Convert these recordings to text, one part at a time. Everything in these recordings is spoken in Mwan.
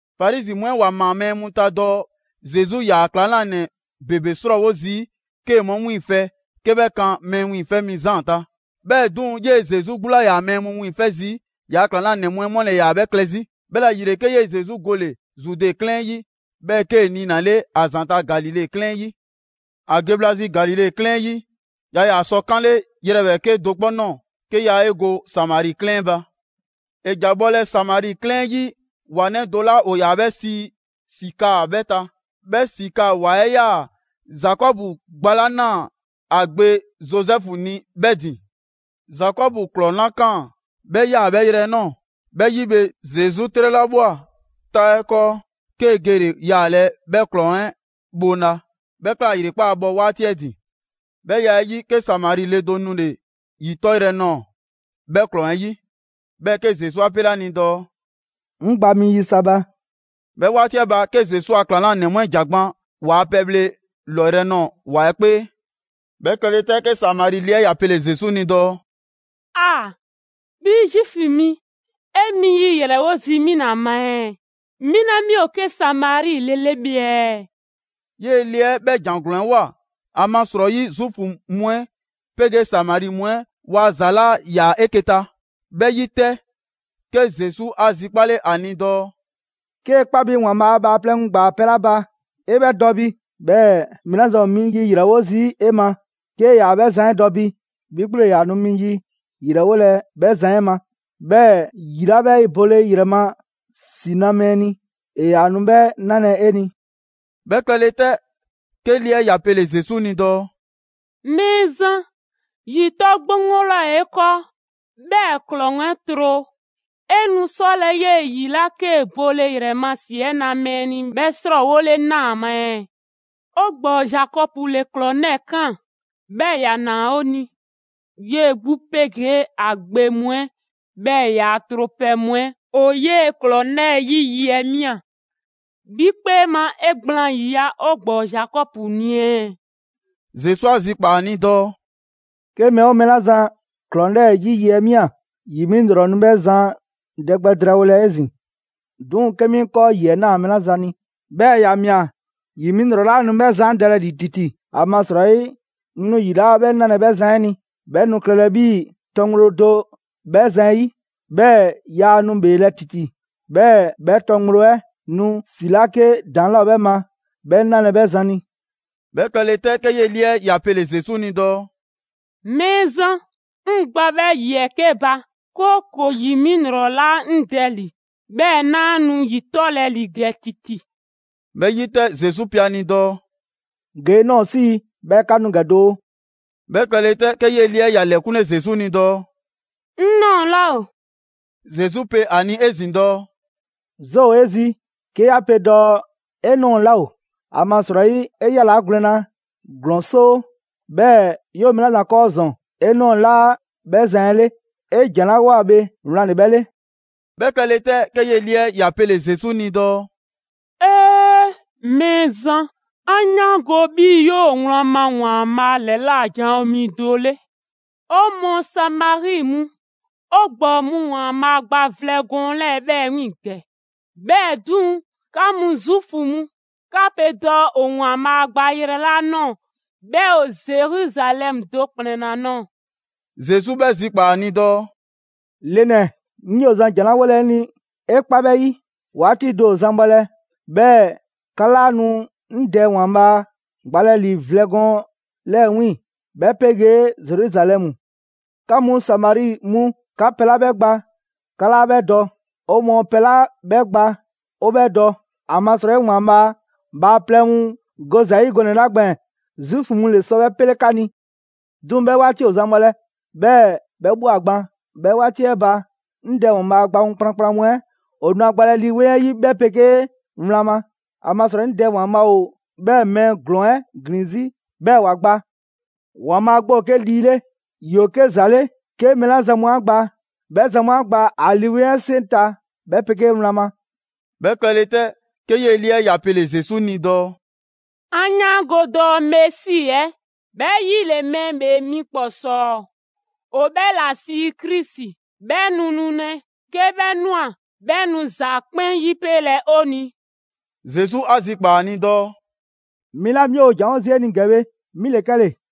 Farizi mu 'ɛ ‑wa ‑maa mɛɛ mu ta dɔɔ Zesu 'yaa‑ ‑klaŋlanɛ ‑bebe 'srɔɔwo zii' 'kee‑ 'mu 'wiiŋfɛ‑ 'ke 'bhɛ kan Mɛɛ Wiiŋfɛ' Mi Zaan ta. 'Bhɛɛ‑ 'duŋ‑, 'yee‑ Zesu 'gbu 'laa ‑yaa mɛɛ mu wiiŋfɛ' zii', ‑yaa' ‑klaŋlanɛ mu 'ɛ 'mu ‑le ‑yaa 'bhɛ klɛ 'zi. 'Bhɛla‑ ‑yile, 'ke 'yee‑ Zesu gole‑ Zude 'klɛɛn 'ɛ 'yi, 'bhɛɛ‑ 'kee‑ niinale ‑a ‑zanta' Galile 'klɛɛn 'ɛ 'yi. ‑A ge bhla zi Galile 'klɛɛn 'ɛ 'yi, yaa ‑yaa sɔ 'kanle ‑yrɛ ‑bhɛɛke' do 'kpɔ ꞊nɔɔ 'ke yaa 'e go Samari 'klɛɛn 'ɛ ba. ‑E ‑ja bhɔlɛ Samari 'klɛɛn 'ɛ 'yi ‑wa 'nɛ do 'la ‑o ‑yaa 'bhɛ sii Sikaa 'bhɛɛ‑ ta. 'Bhɛ Sikaa ‑wa 'ɛ 'yaa‑ Zakɔbu gba 'la 'naa‑ ‑a gbe Zozɛfu ni 'bhɛɛ‑ ‑din. Zakɔbu ‑klɔŋ 'la 'kaan‑, 'bhɛ 'yaa‑ 'bhɛ yrɛ 'ɛ ꞊nɔɔ. 'Bhɛ 'yi bhe, Zesu 'trɛlabhwa 'taa 'ɛ 'kɔɔ, 'kee‑ gele‑ yaalɛ 'bhɛ ‑klɔŋ 'ɛ bhoŋla. 'Bhɛ ꞊kla ‑yrekpaa' bhɔ 'waati 'ɛ ‑din. 'Bhɛ ya 'ɛ 'yi, 'ke Samari le do nule‑ ‑yi 'tɔyrɛ‑ nɔɔ‑ 'bhɛ ‑klɔŋ 'ɛ 'yi. 'Bhɛɛ‑ 'ke Zesu 'a 'pele 'a ni dɔɔ: «'Ŋ gba mi yi sa ba.» 'Bhɛ 'waati 'ɛ ba, 'ke Zesu a ‑klaŋlanɛ mu 'ɛ ‑ja gban ‑waa' pɛbhle ‑lɔyrɛ' nɔɔ‑ ‑wa 'ɛ 'kpee. 'Bhɛ klɛle 'tɛ, 'ke Samari le 'ɛ ‑ya pele‑ Zesu ni dɔɔ: «'Aa! 'Bhi Zuufu mi, 'e mi yi ‑yrɛwo' zii' 'mi ‑la ma ɛɛ, 'mi 'la 'mi ‑o 'ke Samari le 'le bhe ɛɛ?» 'Yee‑ ‑le 'ɛ 'bhɛ ‑jan ‑glɔɔn 'ɛ ꞊woa, ‑amasrɔyi Zuufu mu 'ɛ 'pegee Samari mu 'ɛ waa ‑za 'laa ‑yaa 'eke‑ ta. 'Bhɛ 'yi 'tɛ, 'ke Zesu 'a zikpale ‑a ni dɔɔ: «'Kee‑ 'kpa bi ‑Waanbhaa' bhaaplɛŋ mu ‑gbaa pɛ 'la ba 'e 'bhɛ dɔ bi, 'bhɛɛ‑ mɛɛ 'la zan ‑o mi yi ‑yrɛwo' zii' 'e ma, 'kee 'yaa‑ 'bhɛ zan 'ɛ dɔ bi, 'bhi 'gbu ‑le ‑yaa nu mi yi ‑yrɛwolɛ 'bhɛ zan 'ɛ ma. 'Bhɛɛ‑ ‑yi 'la 'bhɛ bole ‑yrɛ ma ‑si na mɛɛ ni, ‑e ‑yaa nu 'bhɛɛ‑ 'nalɛ‑ 'e ni.» 'Bhɛ klɛle 'tɛ, 'ke le 'ɛ ‑ya pele‑ Zesu ni dɔɔ: «Mɛɛzan, ‑yi 'tɔ 'gboŋgbo 'laa ‑o 'e 'kɔɔ, 'bhɛɛ‑ ‑klɔŋ 'ɛ tro. 'E nu 'sɔlɛ‑ 'yee‑ ‑yi 'la 'kee‑ bole ‑yrɛ ma ‑si 'ɛ na mɛɛ ni 'bhɛ 'srɔɔwole 'naa ma ɛɛ? 'O ‑gbɔɔ Zakɔbu ‑le ‑klɔŋ 'lɛɛ‑ 'kaan‑, 'bhɛɛ‑ ‑ya ‑naa 'o ni. 'Yee‑ 'gbu 'pegee ‑a gbe mu 'ɛ, 'bhɛɛ‑ ‑yaa' tropɛ mu 'ɛ ‑o 'yee‑ ‑klɔŋ 'lɛɛ‑ 'yi yi 'ɛ ꞊mia. 'Bhi 'kpee ma 'e gblaan ‑yiya' 'o ‑gbɔɔ Zakɔbu ni ɛɛ?» Zesu 'a zikpaa‑ ‑a ni dɔɔ: «'Ke mɛɛ 'oo mɛɛ 'la zan ‑klɔŋ 'lɛɛ‑ 'yi yi 'ɛ ‑mia, ‑yi 'mi ‑lrɔ nu 'bhɛ zan dɛ gbɛ drɛɛwolɛ 'ezin‑; 'duŋ‑ 'ke 'mi 'ŋ 'kɔɔ ‑yi 'ɛ ꞊naa mɛɛ 'la zan ni, 'bhɛɛ‑ ‑ya ‑mia, ‑yi 'mi ‑lrɔ 'laa nu 'bhɛ zan 'ɛ dɛlɛ ‑li ‑titi. ‑Amasrɔyi, 'ŋ nu ‑yi 'la 'bhɛ 'nalɛ‑ 'bhɛ zan 'ɛ ni, 'bhɛ nu klɛlɛ 'bhii‑ tɔ ŋgblo do 'bhɛ zan 'ɛ 'yi, 'bhɛɛ‑ yaa nu ‑bheelɛ' ‑titi. 'Bhɛɛ‑ 'bhɛ tɔ ŋgblo 'ɛ nu ‑si 'la 'ke ‑daŋ' 'laa 'bhɛ ma 'bhɛ 'nalɛ‑ 'bhɛ zan ni.» 'Bhɛ klɛlɛ 'tɛ, 'ke 'yee‑ le 'ɛ ‑ya pele‑ Zesu ni dɔɔ: «Mɛɛzan, 'ŋ gba 'bhɛ ‑yi 'ɛ 'ke ba, 'kooko‑ ‑yi 'mi ‑lrɔ 'laa 'ŋ dɛ ‑li, 'bhɛɛ‑ 'naa nu ‑yi 'tɔlɛ‑ ‑li ‑gɛ ‑titi.» 'Bhɛ 'yi 'tɛ, Zesu pe ‑a ni dɔɔ: «Ge 'e ꞊nɔɔ 'sii‑, 'bhɛɛ‑ 'ka nu ‑gɛ doo.» 'Bhɛ klɛle 'tɛ, 'ke 'yee‑ le 'ɛ ‑ya ‑lɛkunle Zesu ni dɔɔ: «'Ŋ ꞊nɔɔ 'laa ‑o.» Zesu pe ‑a ni 'ezin‑ dɔɔ: «'Zoo ‑o 'e zi 'ke 'ya pe dɔɔ 'e ꞊nɔɔ 'laa ‑o; ‑amasrɔyi, 'e 'yalaa gwlɛn na ‑glɔɔn 'soo, 'bhɛɛ‑ 'yoo‑ mɛɛ 'la zan 'kɔɔ ‑zɔn, 'e ꞊nɔɔ 'laa 'bhɛ zan 'ɛ 'le. 'E ‑jan 'la ꞊woa bhe wlan ‑le 'bhɛ 'le.» 'Bhɛ klɛle 'tɛ, 'ke 'yee‑ le 'ɛ ‑ya pele‑ Zesu ni dɔɔ: «'Ee! Mɛɛzan, 'an 'yaango‑ 'bhii‑ 'yoo‑ wlan ma ‑Waanbhaa' ‑lɛla' janwo mi do 'le. 'O mɔɔ Samari mu, 'o ‑gbɔɔ mu ‑Waanbhaa' ‑gbaa vlɛ gɔɔn 'lɛɛ‑ 'bhɛɛ‑ 'wiiŋ‑ ‑gɛ, 'bhɛɛ‑ 'duŋ‑, 'ka mu Zuufu mu, 'ka pe dɔɔ ‑o ‑Waanbhaa' gba yrɛ 'la ꞊nɔɔ, 'bhɛ ‑o Zeruzalɛmu do ‑kplɛn 'la ꞊nɔɔ.» Zesu 'bhɛ zikpaa‑ ‑a ni dɔɔ: «Le ‑nɛ, 'ŋ 'yoo zan ‑jan 'la 'wolɛ‑ 'e ni 'e 'kpa 'bhɛ 'yi, 'waati do ‑o zan bhɔlɛ', 'bhɛɛ‑ 'ka 'laa nu 'ŋ Dɛ ‑Waanbhaa' gbalɛ ‑li vlɛ gɔɔn 'lɛɛ‑ 'wiiŋ‑, 'bhɛ 'pegee Zeruzalɛmu. 'Ka mu Samari mu, 'ka pɛ 'la 'bhɛ gba 'ka 'laa 'bhɛ dɔ; 'o mɔɔ pɛ 'la 'bhɛ gba 'o 'bhɛ dɔ, ‑amasrɔyi ‑Waanbhaa' bhaaplɛŋ mu go ‑za 'yi gɔnɛ‑ 'la gbɛɛn‑, Zuufu mu ‑le sɔ 'bhɛ 'pele 'ka ni. 'Duŋ‑ 'bhɛ 'waati ‑o zan bhɔlɛ, 'bhɛɛ‑ 'bhɛ ꞊bhwa gban, 'bhɛ 'waati 'ɛ ba, 'ŋ Dɛ ‑Waanbhaa' gba mu kplankplan mu 'ɛ ‑o nu ‑a gbalɛ Lii 'Weŋ 'ɛ 'yi 'bhɛ 'pegee wlan ma. ‑Amasrɔyi 'ŋ Dɛ ‑Waanbhaa' ‑o 'bhɛɛ‑ mɛɛ ‑glɔɔn 'ɛ ‑glin 'zi 'bhɛɛ‑ ‑wa gba. ‑Waanbhaa' 'gbu ‑o 'ke Lii 'le, ‑yoo 'ke ‑za 'le 'ke mɛɛ 'la zan mu 'a gba, 'bhɛ zan mu 'a gba ‑a Lii 'Weŋ 'ɛ 'seŋ ta 'bhɛ 'pegee wlan ma.» 'Bhɛ klɛle 'tɛ, 'ke 'yee‑ le 'ɛ ‑ya pele‑ Zesu ni dɔɔ: «'An 'yaango‑ dɔɔ Mesi 'ɛ ('bhɛ 'yi ‑le ‹Mɛɛ ‑Bhee Mi ‑Kpɔsɔɔ›) ‑o 'bhɛ ‑la sii Krisi, 'bhɛ nu nulɛ. 'Ke 'bhɛ ꞊nwa 'bhɛ nu ‑za 'kpɛn 'yipelɛ 'o ni.» Zesu 'a zikpaa‑ ‑a ni dɔɔ: «'Mi 'la 'mi ‑o ‑janwo' zii' 'e ni ‑gɛ bhe, 'mi ‑le 'kɛle‑.»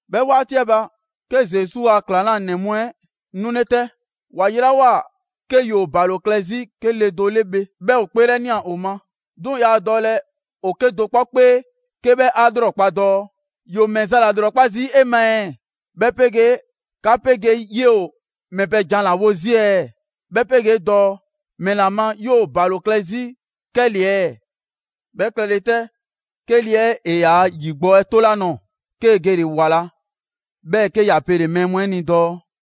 'Bhɛ 'waati 'ɛ ba, 'ke Zesu ‑a ‑klaŋlanɛ mu 'ɛ 'nule 'tɛ; ‑wa yelawoa 'ke ‑yoo ‑balo klɛ 'zi 'ke le do 'le bhe, 'bhɛ ‑o 'kpeelɛnia ‑o ma. 'Duŋ‑ yaa dɔlɛ ‑o 'kedo‑ 'kpɔ 'kpee 'ke 'bhɛ 'a 'lrɔkpa‑ dɔɔ: «‑Yoo ‑mɛ za ‑la ‑yilrɔkpa zii' 'e ma ɛɛ? 'Bhɛ 'pegee 'ka 'pegee 'yee‑ ‑o ‑mɛ pɛ jan ‑la wo zii' ɛɛ?» 'Bhɛ 'pegee dɔɔ: «‑Mɛla ma 'yoo‑ ‑balo klɛ 'zi 'kɛle‑ ɛɛ?» 'Bhɛ klɛle 'tɛ, 'ke le 'ɛ ‑e yaa ‑yi gbɔ 'ɛ 'tole ‑a nɔɔ‑, 'kee‑ gele‑ ‑wa ꞊la, 'bhɛɛ‑ 'ke ‑ya pele‑ mɛɛ mu 'ɛ ni dɔɔ: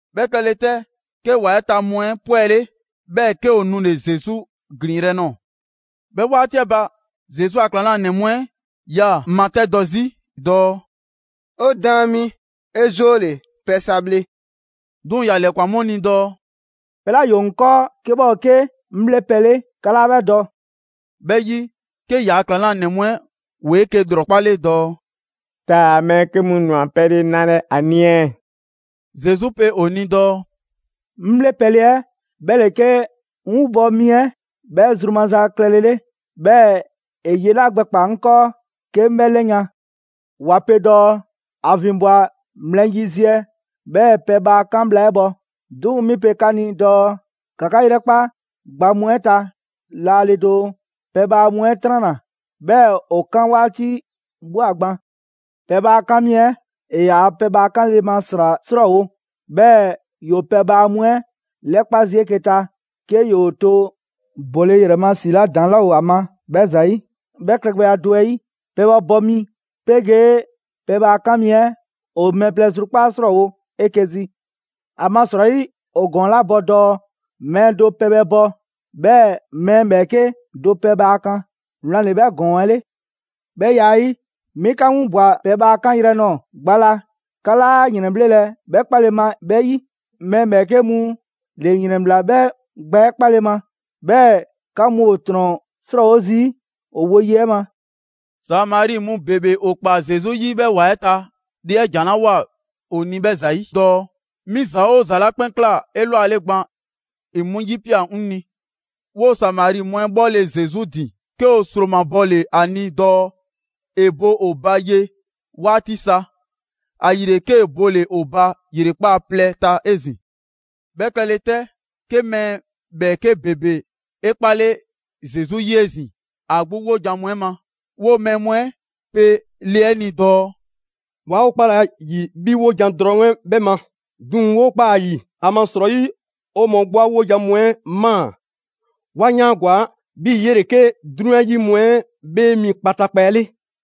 'Bhɛ klɛle 'tɛ, 'ke ‑wa 'ɛ ta mu 'ɛ 'pwɛle, 'bhɛɛ‑ 'ke ‑o nule‑ Zesu ‑glinyrɛ' nɔɔ‑. 'Bhɛ 'waati 'ɛ ba, Zesu a ‑klaŋlanɛ mu 'ɛ 'yaa‑ matɛdɔ 'zi dɔɔ: «'O Daan mi, 'e 'zoole‑, pɛ sa bhle!» 'Duŋ‑, ‑ya ‑lɛkwan 'mu ni dɔɔ: «Pɛ 'la ‑yoo 'ŋ 'kɔɔ 'ke 'bhɛ ‑o 'ke 'ŋ 'bhle pɛ 'le, 'ka 'laa 'bhɛ dɔ.» 'Bhɛ 'yi, 'ke ‑yaa' ‑klaŋlanɛ mu 'ɛ ‑woo 'eke‑ ‑lrɔkpale dɔɔ: «Taa‑ mɛɛ 'ke mu ‑nwa pɛle nalɛ ‑a ni ɛɛ?» Zesu pe ‑o ni dɔɔ: «'Ŋ 'bhle pɛle 'ɛ 'bhɛ ‑le 'ke 'ŋ 'winbɔ‑ mi 'ɛ 'bhɛ zru maza klɛle 'le, 'bhɛɛ‑ ‑e ye 'la gbɛkpaa‑ 'ŋ 'kɔɔ 'ke 'ŋ 'bhɛ 'lɛyan‑. ‑Wa pe dɔɔ: ‹‑A ‑vinbwa mlɛ yiziɛ 'bhɛɛ‑ pɛbhaa 'kan bhla 'ɛ bhɔ.› 'Duŋ‑ 'mi pe 'ka ni dɔɔ ‑ka 'ka 'yrɛkpa gba mu 'ɛ ta laale doo, pɛbhaa mu 'ɛ 'tranna‑, 'bhɛɛ‑ ‑o 'kan 'waati ꞊bhwa gban! Pɛbhaa 'kan mi 'ɛ, ‑e ‑yaa pɛbhaa 'kanle‑ ma ‑sra 'srɔɔwo‑, 'bhɛɛ‑ ‑yoo pɛbhaa mu 'ɛ 'lɛkpa‑ zii' 'eke‑ ta 'ke ‑yoo to bole ‑yrɛ ma ‑si 'la ‑daŋ' 'laa ‑o ‑a ma 'bhɛ ‑zayi'. 'Bhɛ klɛgbɛya do 'ɛ 'yi, pɛbhɛ bɔ mi 'pegee pɛbhaa 'kan mi 'ɛ ‑o mɛɛ plɛ zrukpaa' 'srɔɔwo‑ 'eke‑ zi. ‑Amasrɔyi, ‑o ‑gɔɔn 'la bɔ dɔɔ: ‹Mɛɛ do pɛbhɛ bɔ, 'bhɛɛ‑ mɛɛ ‑bhɛɛke' do pɛbhaa kan.› Wlan ‑le 'bhɛ ‑gɔɔn 'ɛ 'le. 'Bhɛ ya 'ɛ 'yi, 'mi 'ka 'winbwa‑ pɛbhaa 'kanyrɛ‑ nɔɔ‑ gba 'la 'ka 'laa ‑yrɛnbhlelɛ 'bhɛ 'kpale ma 'bhɛ 'yi; mɛɛ ‑bhɛɛke' mu ‑le ‑yrɛnbhla 'bhɛ gba 'ɛ 'kpale‑ ma, 'bhɛɛ‑ 'ka mu ‑o ‑trɔn 'srɔɔwo zii' ‑o woye 'ɛ ma.» Samari mu ‑bebe ‑o ꞊kpaa Zesu 'yi 'bhɛ ‑wa 'ɛ ta, le 'ɛ ‑jan 'la ꞊woa ‑o ni 'bhɛ ‑zayi' dɔɔ: «'Mi ‑za 'oo ‑za mu 'la 'kpɛn ꞊kla 'elwale gban, ‑e 'mu 'yipia꞊ 'ŋ ni.» 'Woo‑ Samari mu 'ɛ 'bhɔle‑ Zesu ‑din, 'ke ‑o ‑sromabɔle ‑a ni dɔɔ ‑e bo ‑o ba ye 'waati sa. ‑Ayile, 'kee‑ bole‑ ‑o ba ‑yrekpaa' plɛ ta 'ezin‑. 'Bhɛ klɛle 'tɛ, 'ke mɛɛ ‑bhɛɛke' ‑bebe 'e 'kpale Zesu 'yi 'ezin‑ ‑a 'gbu 'wojan‑ mu 'ɛ ma. 'Woo‑ mɛɛ mu 'ɛ pe le 'ɛ ni dɔɔ: «'Waa 'o 'kpalɛ‑ ‑a ‑yi 'bhi 'wojan‑ drɔŋ 'ɛ 'bhɛ ma, 'duŋ‑ 'woo ꞊kpaa ‑a ‑yi, ‑amasrɔyi 'o mɔɔ 'gbu 'a wojan mu 'ɛ ꞊maa, 'wa 'yaangwa‑ 'bhii‑ 'yele‑ 'ke 'drunyan 'yi mu 'ɛ 'Bhee Mi kpataakpa 'ɛ 'le.»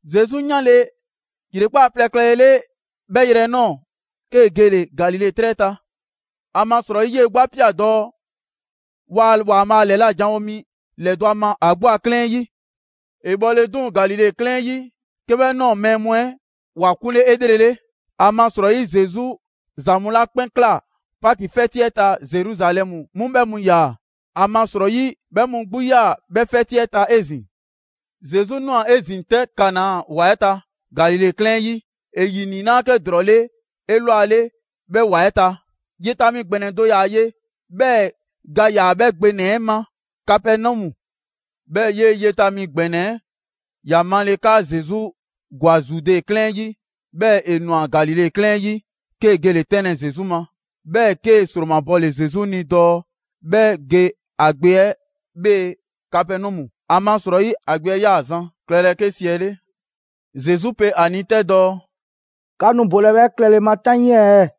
Zesu 'yanle ‑yrekpaa' plɛ klɛlele 'bhɛ yrɛ 'ɛ ꞊nɔɔ, 'kee‑ gele‑ Galile 'trɛ ta. ‑Amasrɔyi 'yee‑ 'gbu 'a ꞊pia‑ dɔɔ: «Waa ‑Waanbhaa' ‑lɛla' janwo mi ‑lɛdɔ' a ma ‑a 'gbu a 'klɛɛn 'yi.» ‑E bhɔle 'duŋ‑ Galile 'klɛɛn 'ɛ 'yi, 'ke bhɛ ꞊nɔɔ mɛɛ mu 'ɛ ‑wa 'kunle 'elrele. ‑Amasrɔyi Zesu ‑za mu 'la 'kpɛn ꞊kla Paki 'fɛti 'ɛ ta Zeruzalɛmu 'mu 'bhɛ mu ꞊ya. ‑Amasrɔyi 'bhɛ mu 'gbu 'yaa‑ 'bhɛ 'fɛti 'ɛ ta 'ezin‑. Zesu ꞊nwa 'ezin‑ 'tɛ Kana ‑wa 'ɛ ta, Galile 'klɛɛn 'ɛ 'yi; ‑e ‑yi 'niinaa‑ 'ke ‑drɔɔ 'le 'elwale 'bhɛɛ‑ ‑wa 'ɛ ta. Yeta mi ‑gbɛnɛ do ‑yaa ye, 'bhɛɛ‑ ga ‑yaa 'bhɛ gbe ‑nɛ 'ɛ ma Kapɛnɔmu. 'Bhɛɛ‑, 'yee‑ yeta mi ‑gbɛnɛ 'ɛ ‑ya male 'kaa Zesu ‑gwa Zude 'klɛɛn 'ɛ 'yi, 'bhɛɛ‑ ‑e ꞊nwa Galile 'klɛɛn 'ɛ 'yi, 'kee‑ gele‑ 'tɛnlɛ‑ Zesu ma. 'Bhɛɛ‑ 'kee‑ ‑sromabɔle Zesu ni dɔɔ 'bhɛ ge ‑a gbe 'ɛ 'bhee‑ Kapɛnɔmu. ‑Amasrɔyi ‑a gbe 'ɛ 'yaa‑ zan klɛlɛ 'ke 'siɛle. Zesu pe ‑a ni 'tɛ dɔɔ: «'Ka nu bolɛ 'bhɛɛ‑ klɛle ma 'taŋii ɛɛ?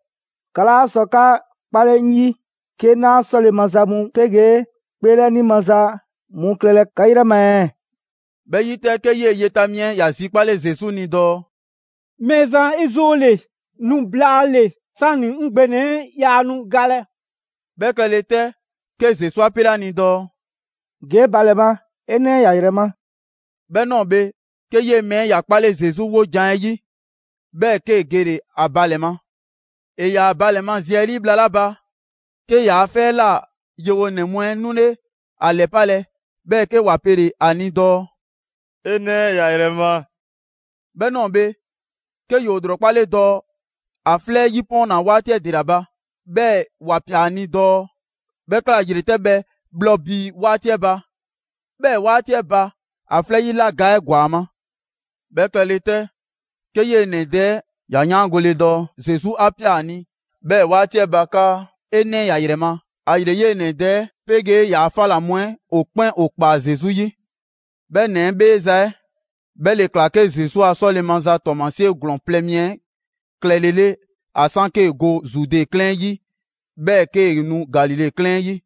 'Ka 'laa sɔ 'ka 'kpale 'ŋ 'yi, 'ke 'naa 'sɔle‑ maza mu 'pegee 'kpeelɛni maza mu klɛlɛ 'ka 'yrɛ ma ɛɛ?» 'Bhɛ 'yi 'tɛ, 'ke 'yee‑ yeta mi 'ɛ ‑ya zikpale Zesu ni dɔɔ: «Mɛɛzan, 'e 'zoole‑, nu blaale‑ 'sani 'ŋ gbe ‑nɛ 'ɛ yaa nu galɛ.» 'Bhɛ klɛle 'tɛ, 'ke Zesu 'a 'pele 'a ni dɔɔ: «Ge 'e ba ‑lɛ ma, 'e 'nɛ ‑ya ‑yrɛ ma.» 'Bhɛ ꞊nɔɔ bhe, 'ke 'yee‑ mɛɛ ‑ya 'kpale Zesu 'wojan‑ 'ɛ 'yi, 'bhɛɛ‑ 'kee‑ gele‑ ‑a ba ‑lɛ ma. ‑E ‑yaa ‑a ba ‑lɛ ma zi 'ɛ 'lii bhla 'la ba, 'ke ‑yaa' 'fɛ 'ɛ ꞊la yewonɛ mu 'ɛ 'nule ‑a ‑lɛpalɛ, 'bhɛɛ‑ 'ke ‑wa pele‑ ‑a ni dɔɔ: «'E 'nɛ ‑ya ‑yrɛ ma!» 'Bhɛ ꞊nɔɔ bhe, 'ke ‑yoo ‑lrɔkpale dɔɔ ‑a 'flɛ 'yi 'pɔɔnna‑ 'waati 'ɛ ‑dela ba. 'Bhɛɛ‑ ‑wa ꞊pia ‑a ni dɔɔ 'bhɛ ‑kla ‑yretɛbhɛ bhlɔ bii 'waati 'ɛ ba. 'Bhɛɛ‑ 'waati 'ɛ ba, ‑a 'flɛ 'yi 'la ga 'ɛ ‑gwa ‑a ma. 'Bhɛ klɛle 'tɛ, 'ke 'yee‑ ‑nɛ dɛ 'ɛ ‑ya 'yaangole dɔɔ Zesu 'a ꞊pia ‑a ni 'bhɛɛ‑ 'waati 'ɛ ba 'kaa: «'E 'nɛ ‑ya ‑yrɛ ma.» ‑Ayile 'yee‑ ‑nɛ dɛ 'ɛ 'pegee ‑yaa' 'fa ꞊la mu 'ɛ ‑o 'kpɛn ‑o ‑kpaa Zesu 'yi. 'Bhɛ ‑nɛ 'ɛ 'bheeza‑ 'ɛ, 'bhɛ ‑le ꞊kla Zesu a 'sɔle‑ maza ‑tɔɔmasie ‑glɔɔn plɛ mi klɛle 'le; ‑a 'san 'kee‑ go Zude 'klɛɛn 'ɛ 'yi, 'bhɛɛ‑ 'kee‑ nu Galile 'klɛɛn 'ɛ 'yi.